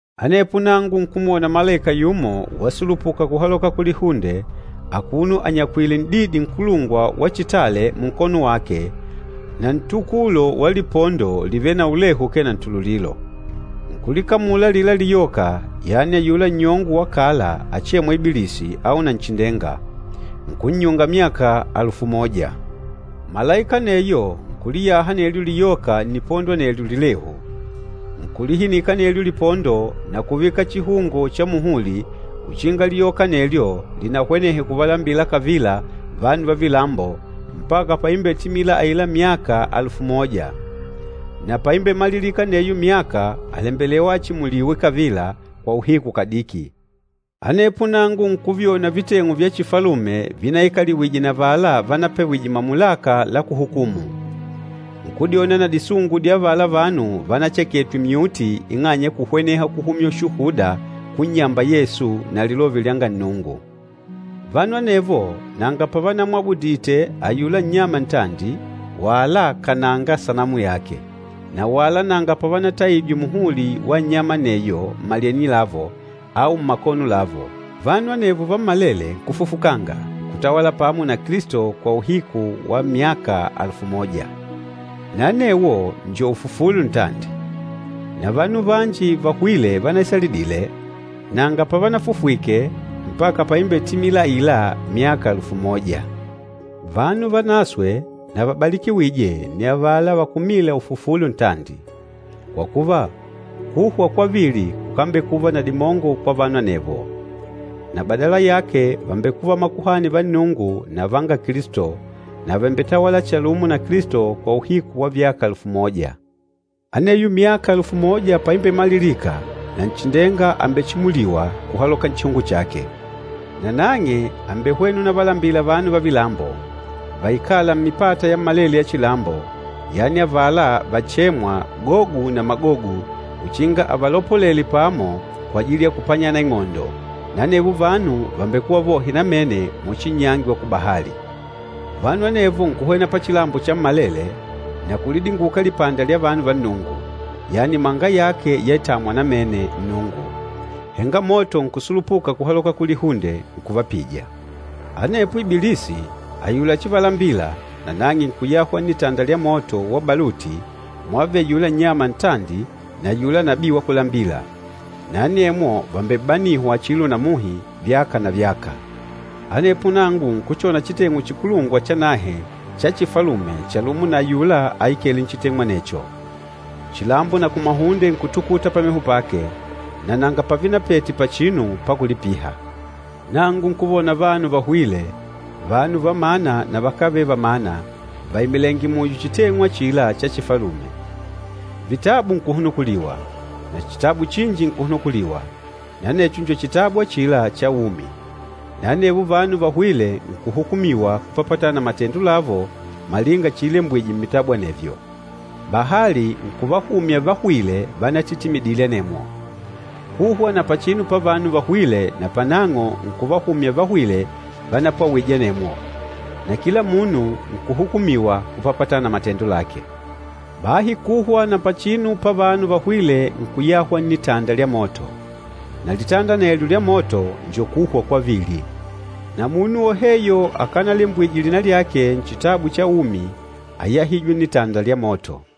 Anepo nangu nkumwona malaika yumo wasulupuka kuhaloka kulihunde akuno anyakwìlè n'didi nkulungwa wa chitale munkono wake na ntukulo wa lipondo livêle na ulehu ukee na ntululilo. Nkulikamula alila liyoka, yani ayula nnyongo wa kala achêmwa Ibilisi au Nanchindenga, nkunnyunga myaka alufu moja. Malaika aneyo nkuliyaha anelyo liyoka nnipondo anelyo lilehu. Nkulihinika anelyo lipondo na kuvika chihungo cha muhuli uchinga liyoka anelyo linahwenehe kuvalambila kavila vanu va vilambo mpaka paimbetimila aila myaka alufu moja. Na paimbemalilika aneyo myaka àlembelewa achimuliwe kavila kwa uhiku kadiki. Anepo nangu nkuvyona viteng'u vya chifalume vinaikaliwije na avala vanapewije mamulaka la kuhukumu. Nkudyona na disungu dya avala vanu vánacheketwe myuti ing'anya ya kuhweneha kuhumya ushuhuda kunnyamba Yesu na Lilove lyanga Nnungu. Vanu anevo nanga pavanamwabudite ayula nnyama ntandi wala kananga sanamu yake na wala nanga pavanataijwe muhuli wa nnyama aneyo mmalyenye lavo au mmakono lavo. Vanu anevo vammalele nkufufukanga, nkutawala pamo na Kilisto kwa uhiku wa myaka alufu moja. Na anewo njo ufufulo ntandi. Na vanu vanji vahwîle vanaisalidile, nanga pavanafufwike mpaka paimbetimila aila myaka alufu moja. Vanu vanaswe na vabalikiwîje nni avala vakumîla ufufulo ntandi! Kwa kuva, kuhwa kwavili kukambekuva na dimongo kwa vanu anevo, na badala yake vàmbekuva makuhani va Nnungu na vanga Kilisto, na vàmbetawala chalumo na Kilisto kwa uhiku wa vyaka alufu moja. Aneyo myaka alufu moja paimbemalilika, Nanchindenga àmbechimuliwa kuhaloka nchihungo chake. Nanang'e àmbehwena unavalambila vanu va vilambo, vaikâla mmipata yammalele ya chilambo, yani avala vachêmwa, Gogu na Magogu uchinga avalopolele pamo kwajili ya kupanyana ing'ondo, na anevo vanu vàmbekuva vohe namene muchi nnyangi wa kubahali. Vanu anevo nkuhwena pachilambo chammalele na kulidinguka lipanda lya vanu va Nnungu, yani imanga yake yaitamwa namene Nnungu. Henga moto nkusulupuka kuhaloka kulihunde nkuvapija. Anepo Ibilisi, ayula áchivalambila, nanang'e nkuyahwa nnitanda lya moto wa baluti mwàvele ayula nnyama ntandi na ayula nabii wa kulambila. Na anemwo vàmbebanihwa chilo na muhi, vyaka na vyaka. Anepo nangu nkuchona chiteng'u chikulungwa chanahe cha chifalume chalumo na ayula aikêle nchiteng'u anecho. Chilambo na kumahunde nkutukuta pameho pake, na nanga pavinapete pachinu pakulipiha. Nangu nkuvona vanu vahwîle, vanu va mana na vakávele va mana vaimilèngè muyo chiteng'u achila cha chifalume. Vitabu nkuhunukuliwa, na chitabu chinji nkuhunukuliwa, na anecho njo Chitabu achila cha Umi. Na anevo vanu vahwîle nkuhukumiwa kupapatana na matendo lavo malinga chiilembwije mmitabu anevyo. Bahali nkuvahumya vahwîle vanatitimidile anemwo. Kuhwa na pachinu pavanu vahwîle napanang'o nkuvahumya vahwîle vanapwawije anemwo. Na kila munu nkuhukumiwa kupapatana na matendo lake. Bahi kuhwa na pachinu pavanu vahwîle nkuyahwa nnitanda lya moto. Na litanda anelyo lya moto njo kuhwa kwavili. Na munu woheyo akanalembwije lina lyake Nchitabu cha Umi, áyahijwe nnitanda lya moto.